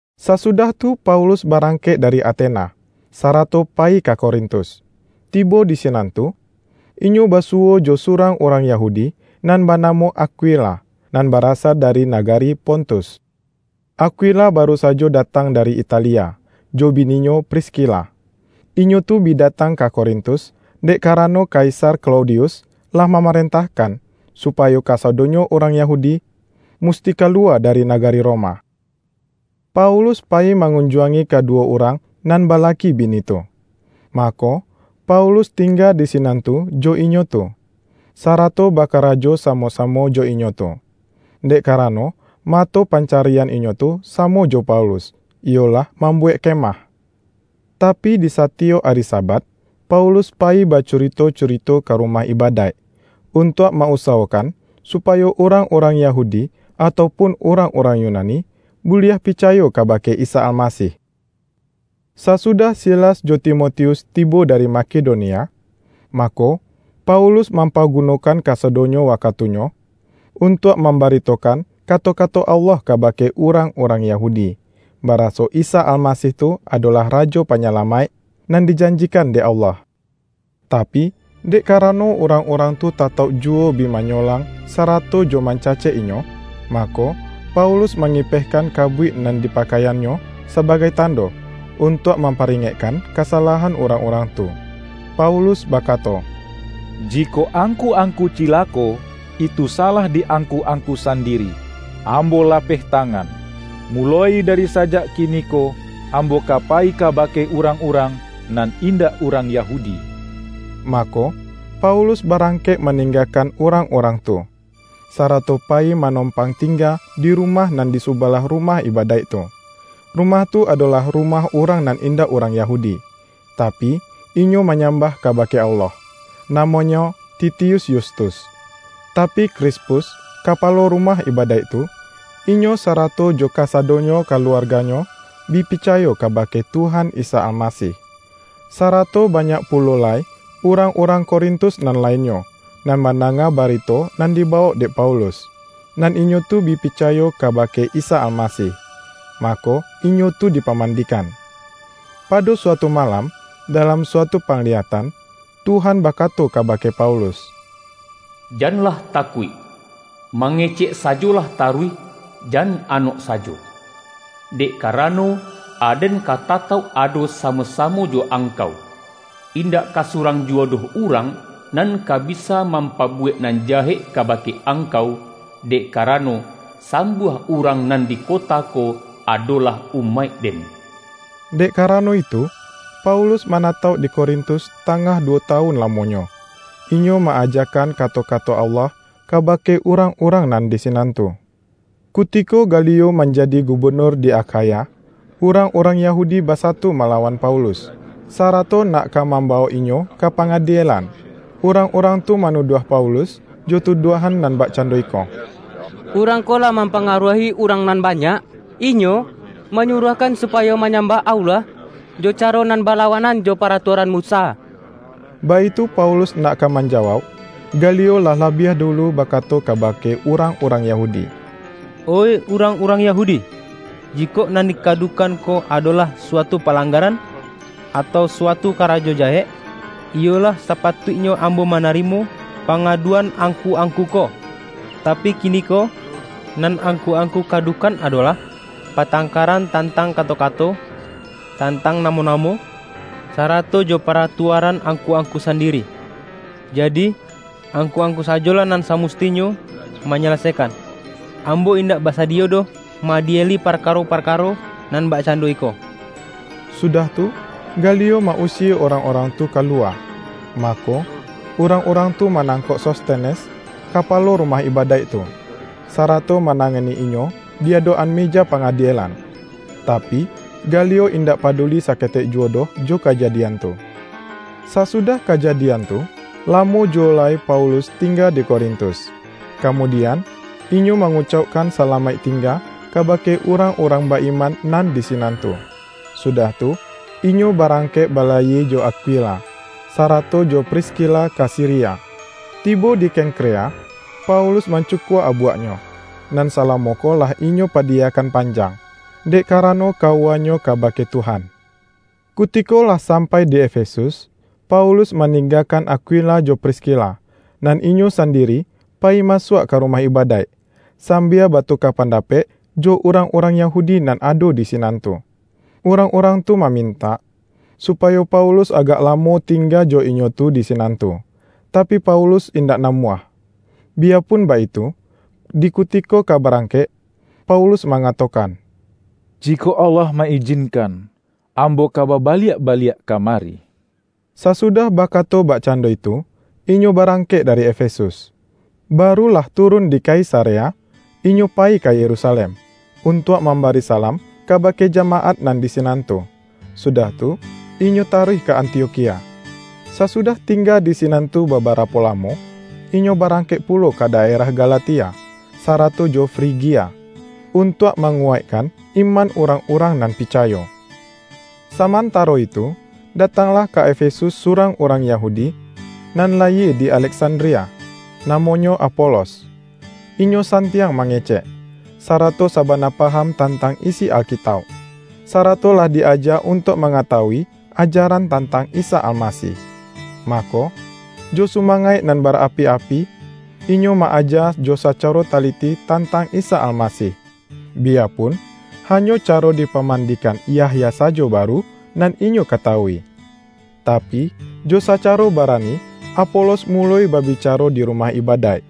Sasudah tu Paulus barangkek dari Atena, sarato payi ka Korintus. Tibo di sinan tu, inyo basuwo jo surang urang Yahudi, nan banamo Akwila, nan barasa dari nagari Pontus. Akwila baru sajo datang dari Italia, jo bininyo Priskila. Inyo tu bi datang ka Korintus, dek karano kaisar Klaudius lah mamarentahkan, supayo kasadonyo urang Yahudi musti kaluwa dari nagari Roma. Paulus payi mangunjuangi kaduwo urang nan balaki bini tu, mako, Paulus tingga di sinan tu jo inyo tu, sarato bakarajo samo-samo jo inyo tu, dek karano mato pancarian inyo tu, samo jo Paulus, iyolah mambuwek kemah. Tapi, di satiyok ari Sabat, Paulus payi bacurito-curito ka rumah ibadaik, untuak ma-usawokan supayo urang-urang Yahudi atau pun urang-urang Yunani, buliah picayo kabake Isa Almasih. Sasudah Silas jo Timotius tibo dari Makedonia, mako, Paulus mam-pagunokan kasadonyo wakatunyo, untuak mambaritokan kato-kato Allah kabake urang-urang Yahudi, baraso Isa Almasih tu adolah Rajo Panyalamaik nan dijanjikan dek Allah. Tapi, dek karano urang-urang tu tatauk juwo bi manyolang sarato jo mancacek inyo, mako Paulus mangipehkan kabuik nan di pakaiannyo sabagai tando, untuak mamparingekkan kasalahan urang-urang tu. Paulus bakato,”Jikok angku-angku cilako, itu salah di angku-angku sandiri! Ambo lapeh tangan! Muloi dari sajak kiniko ambo ka payi kabake urang-urang nan indak urang Yahudi.” Mako, Paulus barangkek maninggakan urang-urang tu, sarato payi manompang tingga di rumah nan di subalah rumah ibadaik tu. Rumah tu adolah rumah urang nan indak urang Yahudi, tapi, inyo manyambah kabake Allah. Namonyo Titius Yustus. Tapi Krispus, kapalo rumah ibadaik tu, inyo sarato jo kasadonyo kaluarganyo, bi picayo kabake Tuhan Isa Almasih. Sarato banyak pulo lai urang-urang Korintus nan lainnyo, nan mandanga barito nan dibawok dek Paulus, nan inyo tu bi picayo kabake Isa Almasih, mako inyo tu dipamandikan. Pado suatu malam, dalam suatu pangliyatan, Tuhan bakato kabake Paulus,”Janlah takuik! Mangecek sajolah taruih, jan anok sajo. Dek karano, Aden ka tatauk ado samo-samo jo angkau. Indak ka surang juwo doh urang, nan ka bisa mampabuwek nan jahek kabake angkau, dek karano sambuah urang nan di kota ko adolah umaik-Den.” Dek karano itu, Paulus manatauk di Korintus tangah duwo tawun lamonyo, inyo ma-ajakan kato-kato Allah kabake urang-urang nan di sinan tu. Kutiko Galio manjadi gubenur di Akhaya, urang-urang Yahudi basatu malawan Paulus, sarato nak ka mambawok inyo ka pangadielan. Urang-urang tu manuduah Paulus, jo tuduahan nan bakcando iko,”Urang ko lah mampangaruahi urang nan banyak, inyo manyuruahkan supayo manyambah Allah jo caro nan balawanan jo paratuaran Musa!” Baitu Paulus nak ka manjawauk, Galio lah labiah dulu bakato kabake urang-urang Yahudi,”Oih urang-urang Yahudi! Jikok nan dikadukan ko adolah suatu palanggaran atau suatu karajo jahek, iyo lah sapatuiknyo ambo manarimo pangaduan angku-angku ko. Tapi kiniko nan angku-angku kadukan adolah, patangkaran tantang kato-kato, tantang namo-namo, sarato jo paratuaran angku-angku sandiri! Jadi angku-angku sajolah nan samustinyo manyalasaikan. Ambo indak basadiyo doh ma-adieli parkaro-parkaro nan bakcando iko!” Sudah tu, Galio ma-usie urang-urang tu ka luwa. Mako, urang-urang tu manangkok Sostenes, kapalo rumah ibadaik tu, sarato manangani inyo di adok-an meja pangadielan. Tapi, Galio indak paduli saketek juwo doh jo kajadian tu. Sasudah kajadian tu, lamo juwo lai Paulus tingga di Korintus. Kamudian, inyo mangucaukkan salamaik tingga, kabake urang-urang ba-iman nan di sinan tu, sudah tu, inyo barangkek balayie jo Akwila, sarato jo Priskila ka Siria. Tibo di Kengkrea Paulus mancukua abuaknyo, nan salamo ko lah inyo padiyakan panjang, dek karano kawuanyo kabake Tuhan. Kutiko lah sampai di Efesus, Paulus maninggakan Akwila jo Priskila, nan inyo sandiri payi masuak ka rumah ibadaik, sambia batuka pandapek jo urang-urang Yahudi nan ado di sinan tu. Urang-urang tu mamintak, supayo Paulus agak lamo tingga jo inyo tu di sinan tu, tapi Paulus indak namuah. Biyapun baitu, di kutiko ka barangkek, Paulus mangatokan,”Jikok Allah ma-ijinkan, ambo ka babaliak baliak ka mari.” Sasudah bakato bakcando itu, inyo barangkek dari Efesus. Baru lah turun di Kaisarea, inyo payi ka Yerusalem, untuak mambari salam kabake jamaat nan di sinan tu, sudah tu inyo taruih ka Antiokhia. Sasudah tingga di sinan tu babarapo lamo, inyo barangkek pulo ka daerah Galatia, sarato jo Frigia, untuak manguwaikkan iman urang-urang nan picayo. Samantaro itu, datanglah ka Efesus surang urang Yahudi nan layie di Aleksandria, namonyo Apolos. Inyo santiang mangecek, sarato sabana paham tantang isi Alkitauk, sarato lah di aja untuak mangatawui ajaran tantang Isa Almasih. Mako, jo sumangaik nan barapi-api, inyo ma-aja jo sacaro taliti tantang Isa Almasih, biyapun, hanyo caro dipamandikan Yahya sajo baru nan inyo katawui. Tapi, jo sacaro barani Apolos muloi babicaro di rumah ibadaik.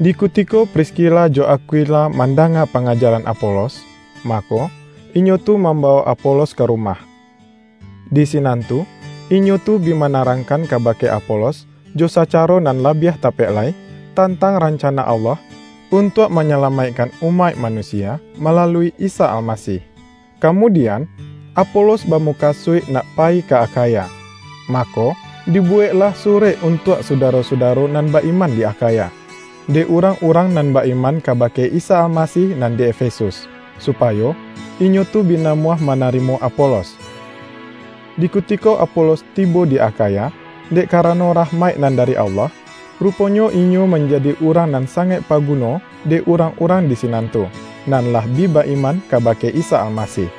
Di kutiko Priskila jo Akwila mandanga pangajaran Apolos, mako, inyo tu mambawok Apolos ka rumah. Di sinan tu, inyo tu bi manarangkan kabake Apolos, jo sacaro nan labiah tapek lai, tantang rancana Allah untuak manyalamaikkan umaik manusia malalui Isa Almasih. Kamudian, Apolos bamukasuik nak payi ka Akhaya. Mako, dibuweklah surek untuak sudaro-sudaro nan ba-iman di Akhaya, dek urang-urang nan ba-iman kabake Isa Almasih, nan di Efesus, supayo inyo tu bi namuah manarimo Apolos. Di kutiko Apolos tibo di Akhaya, dek karano rahmaik nan dari Allah, ruponyo inyo manjadi urang nan sangaik paguno, dek urang-urang di sinan tu, nan lah bi ba-iman kabake Isa Almasih.